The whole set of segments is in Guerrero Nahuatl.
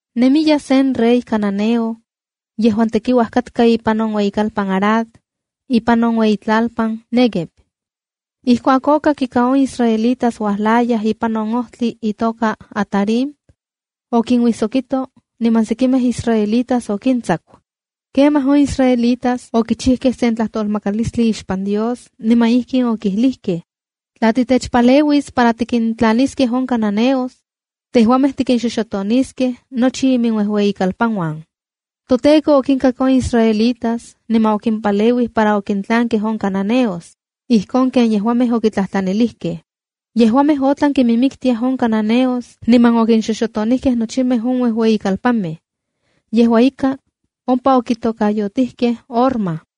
Nemiya sen rey cananeo yejuan tekiuaj katka ipan on ueyikalpan Arad, ipan on iueyitlalpan Néguev. Ijkuak okak ika on israelitas uajlayaj ipan on ojtli itoka Atarim, okinuijsokito niman sekimej israelitas okintsaku. Kemaj on israelitas okichijkej sen tlajtolmakalistli ixpan Dios, niman ijkin okijlijkej: “Tla titechpaleuis para tikintlaniskej on cananeos, tejuamej tikinxoxotoniskej nochi iminuejueyikalpanuan.” ToTEKO okinkak on israelitas niman okimpaleuij para okintlankej on cananeos, ijkon ken yejuamej okitlajtlanilijkej. Yejuamej otlan kiminmiktiaj on cananeos niman okinxoxotonijkej nochimej on uejueyi kalpanmej. Yejua ika, ompa okitokayotijkej Hormaa.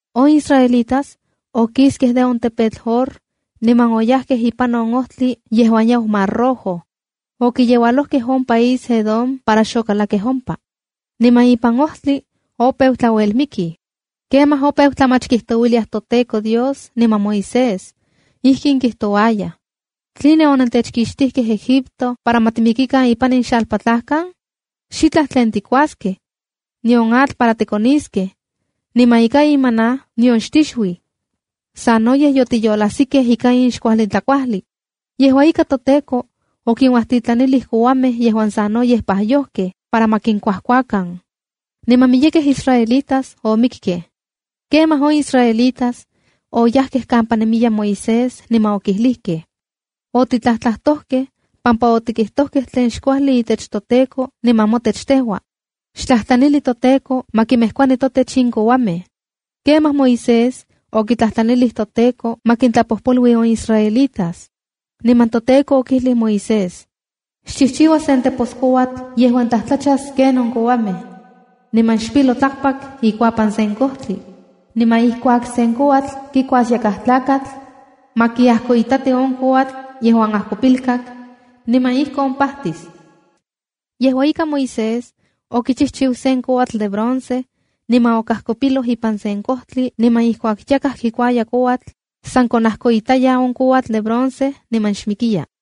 On israelitas okiskej de on tepetl Hor, niman oyajkej ipan on ojtli yejuan yau Mar Rojo. Okiyeualojkej on país Edom para xokalakkej ompa. Niman ipan ojtli opeu tlauelmikij. Kemaj opejkej tlamach kijtouiliaj toTEKO Dios niman Moisés. Ijkin kijtouayaj: —¿Tline onentechkixtijkej Egipto para ma timikikan ipan in xalpatlajkan? ¡Xitlaj tlen tikuaskej, nion atl para tikoniskej! ¡Niman ika in maná nion xtixuij! ¡Sanoyej yotiyolajsikej ika in xkuajli tlakuajli! Yejua ika, toTEKO okinuajtitlanilij kouamej yejuan sanoyej pajyojkejb para ma kinkuajkuakan, niman miyekej israelitas omikkej. Kemaj on israelitas oyajkej kampa nemiya Moisés niman okijlijkej: —Otitlajtlakojkej pampa otikijtojkej tlen xkuajli itech toTEKO niman motech tejua. ¡Xtlajtlanili toTEKO ma kimejkuani totech in kouamej! Kemaj Moisés okitlajtlanilij toTEKO ma kintlapojpolui on israelitas. Niman toTEKO okijlij Moisés: —Xchijchiua sen teposkouatl yejuan tlajtlachas ken on kouamej, niman xpilo tlakpak ikuapan sen kojtli. Niman ijkuak sen kouatl kikuas yakaj tlakatl, ma kiajkoitati on kouatl yejuan ajkopilkak, niman ijkon pajtis. Yejua ika, Moisés okichijchiu sen kouatl de bronce niman okajkopiloj ipan sen kojtli, niman ijkuak yakaj kikuaya kouatl, san konajkoitaya on kouatl de bronce niman xmikiya.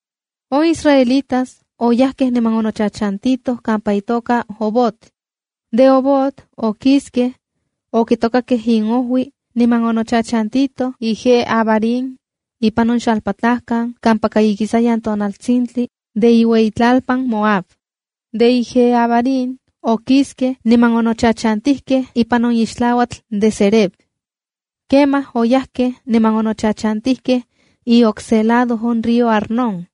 On israelitas oyajkej niman onochachantitoj kampa itoka Obot. De Obot okiskej, okitokakej inojui niman onochachantitoj Ijé-abarim ipan on xalpatlajkan, kampaka ikisayan tonaltsintli de iueyitlalpan Moab. De Ijé-abarim okiskej niman onochachantijkej ipan on ixtlauatl de Zered. Kemaj oyajkej niman onochachantijkej iokse lado on río Arnón.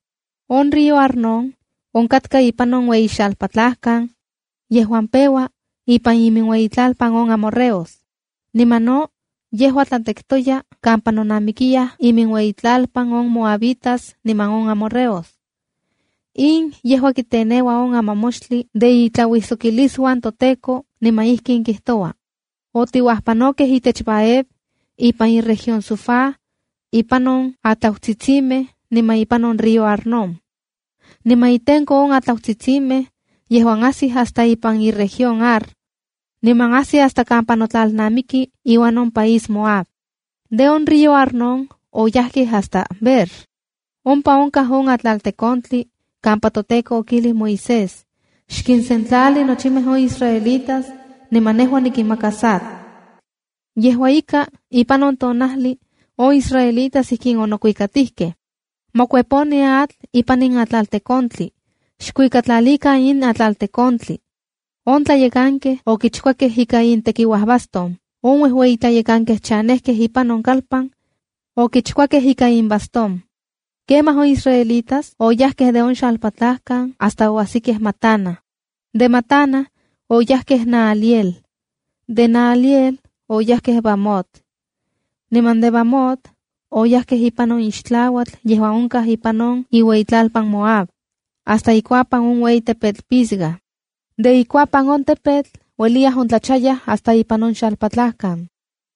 On río Arnón onkatka ipan on ueyi xalpatlajkan yejuan peua ipan iminueyitlalpan on amorreos. Niman no yejua tlatektoya kampa nonamikiyaj iminueyitlalpan on moabitas niman on amorreos. In yejua kiteneua on Amamoxtli de Itlauijsokilisuan toTEKO, niman ijkin kijtoua: “Otiuajpanokej itech Vaheb, ipan iueyitlalpan Sufá, ipan on atlautsitsimej niman ipan on río Arnón, niman intenko on atlautsitsimej yejuan ajsij hasta ipan iueyitlalpan Ar, niman ajsi hasta kampa notlalnamiki iuan on país Moab.” De on río Arnón oyajkej hasta Beerc. Ompa onkaj on atlaltekontli kampa toTEKO okijlij Moisés: “Xkinsentlali nochimej on israelitas niman nejua nikinmakas atl.” Yejua ika, ipan on tonajli on israelitas ijkin onokuikatijkej: “¡Ma kueponi atl ipan in atlaltekontli! ¡Xkuikatlalikan in atlaltekontli! ¡On tlayekankej okichkuakej ika intekiuajbastón, On uejueyitlayekankej chanejkej ipan on kalpan okichkuakej ika inbastón! Kemaj on israelitas oyajkej de on xalpatlajkan hasta oajsikej Matana, de Matana oyajkej Nahaliel, de Nahaliel oyajkej Bamot, niman de Bamot oyajkej ipan on ixtlauatl yejuan onkaj ipan on iueyitlalpan Moab, hasta ikuapan on ueyi tepetl Pisga. De ikuapan on tepetl, ueliya ontlachayaj hasta ipan on xalpatlajkan.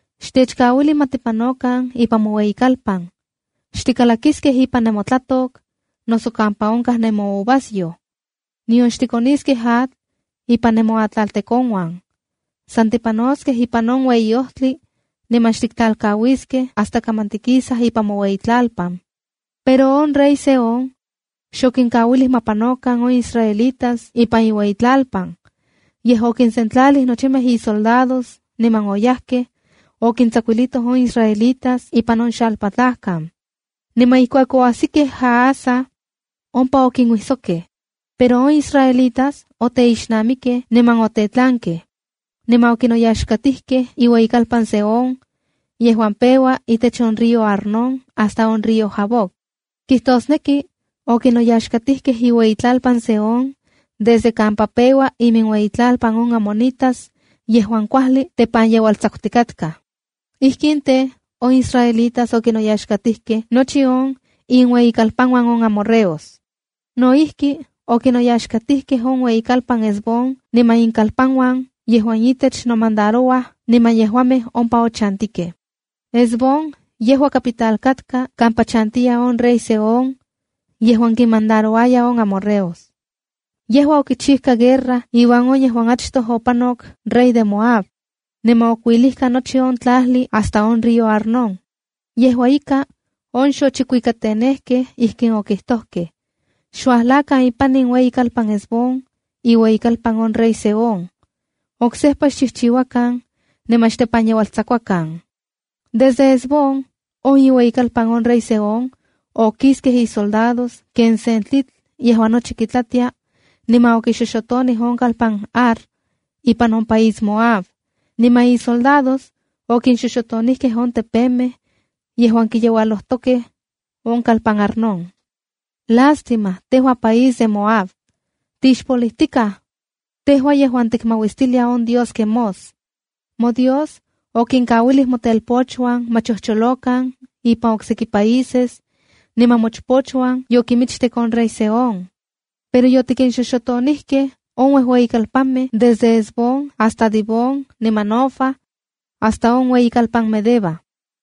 —Xtechkauili ma tipanokan ipan moueyitlalpan. Xtikalakiskej ipan nemotlatok, noso kampa onkaj nemouvasyoj. Nion xtikoniskej atl ipan nemoatlaltekonuan. San tipanoskej ipan on ueyi ojtli niman xtiktlalkauiskej hasta kaman tikisaj ipan moueyitlalpan. Pero on rey Sehón xokinkauilij ma panokan on israelitas ipan iueyitlalpan. Yej okinsentlalij nochimej isoldados niman oyajkej, okintsakuilitoj on israelitas ipan on xalpatlajkan. Niman ijkuak oajsikej Jahaza, ompa okinuijsokkej. Pero on israelitas oteixnamikkej niman otetlankej. Niman okinoyaxkatijkej iueyitlalpan Sehón yejuan peua itech on río Arnón hasta on río Jaboc. Kijtosneki okinoyaxkatijkej iueyitlalpan Sehón desde kampa peua iminueyitlalpan on amonitas yejuan kuajli tepanyeualtsakutikatkaj. Ijkin tej, on israelitas okinoyaxkatijkej nochi on inueyikalpanuan on amorreos. No ijki, okinoyaxkatijkej on ueyikalpan Hesbón niman ikalpanuan yejuan itech nomandarouaj niman yejuamej ompa ochantikej. Hesbón yejua capital katka, kampa chantiya on rey Sehón yejuan kinmandarouaya on amorreos. Yejua okichijka guerra iuan on yejuan achtoj opanok rey de Moab, niman okuilijka nochi on tlajli hasta on río Arnón. Yejua ika, on xochikuikatenejkej ijkin okijtojkej: “¡Xuajlakan ipan in ueyikalpan Hesbón, iueyikalpan on rey Sehón! ¡Oksejpa xchijchiuakan niman xtepanyeualtsakuakan! Desde Hesbón, on iueyikalpan on rey Sehón, okiskej isoldados ken sen tlitl yejuan nochi kitlatia, niman okixoxotonij on kalpan Ar, ipan on país Moab. Niman isoldados okinxoxotonijkej on tepemej yejuan kiyeualojtokej on kalpan Arnón. ¡Lástima, tejua país de Moab! ¡Tixpolijtikaj tejua yejuan tikmauistilia on dios Quemós! Modios okinkauilij motelpochuan ma chojcholokan ipan okseki países, niman mochpochuan yokinmichtek on rey Sehón. Pero yotikinxoxotonijkej on uejueyikalpanmej desde Hesbón hasta Dibón niman Nofa hasta on ueyikalpan Medeba.”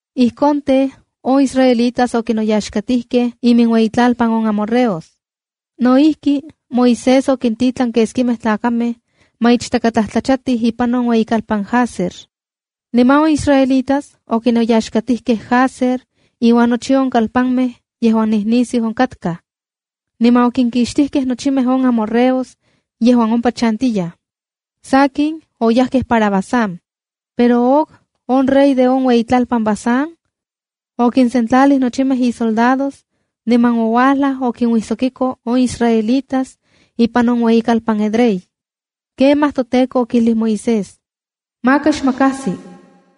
Ijkon tej on israelitas okinoyaxkatijkej iminueyitlalpan on amorreos. No ijki, Moisés okintitlan keskimej tlakamej ma ichtakatlajtlachatij ipan on ueyikalpan Jazer. Niman on israelitas okinoyaxkatijkej Jazer iuan nochi on kalpanmej yejuan nijnisiu onkatkaj, niman okinkixtijkej nochimej on amorreos yejuan ompa chantiyaj. Sakin, oyajkej para Basán, pero Og, on rey de on ueyitlalpan Basán, okinsentlalij nochimej isoldados niman ouajlaj okinuijsokiko on israelitas ipan on ueyikalpan Edrei. Kemaj toTEKO okijlij Moisés: “Maka xmakajsi,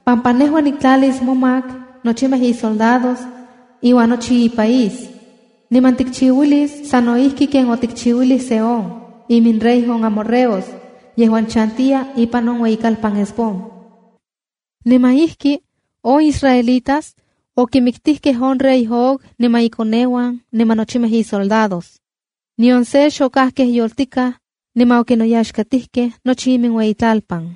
pampa nejua niktlalis momak nochimej isoldados iuan nochi ipaís. Niman tikchiuilis sa no ijki ken otikchiuilij Sehón, iminrey on amorreos yejuan chantiya ipan on ueyikalpan Hesbón.” Niman ijki on israelitas okimiktijkej on rey Og, niman ikoneuan niman nochimej isoldados. Nion se xokajkej yoltikaj niman okinoyaxkatijkej nochi iminueyitlalpan.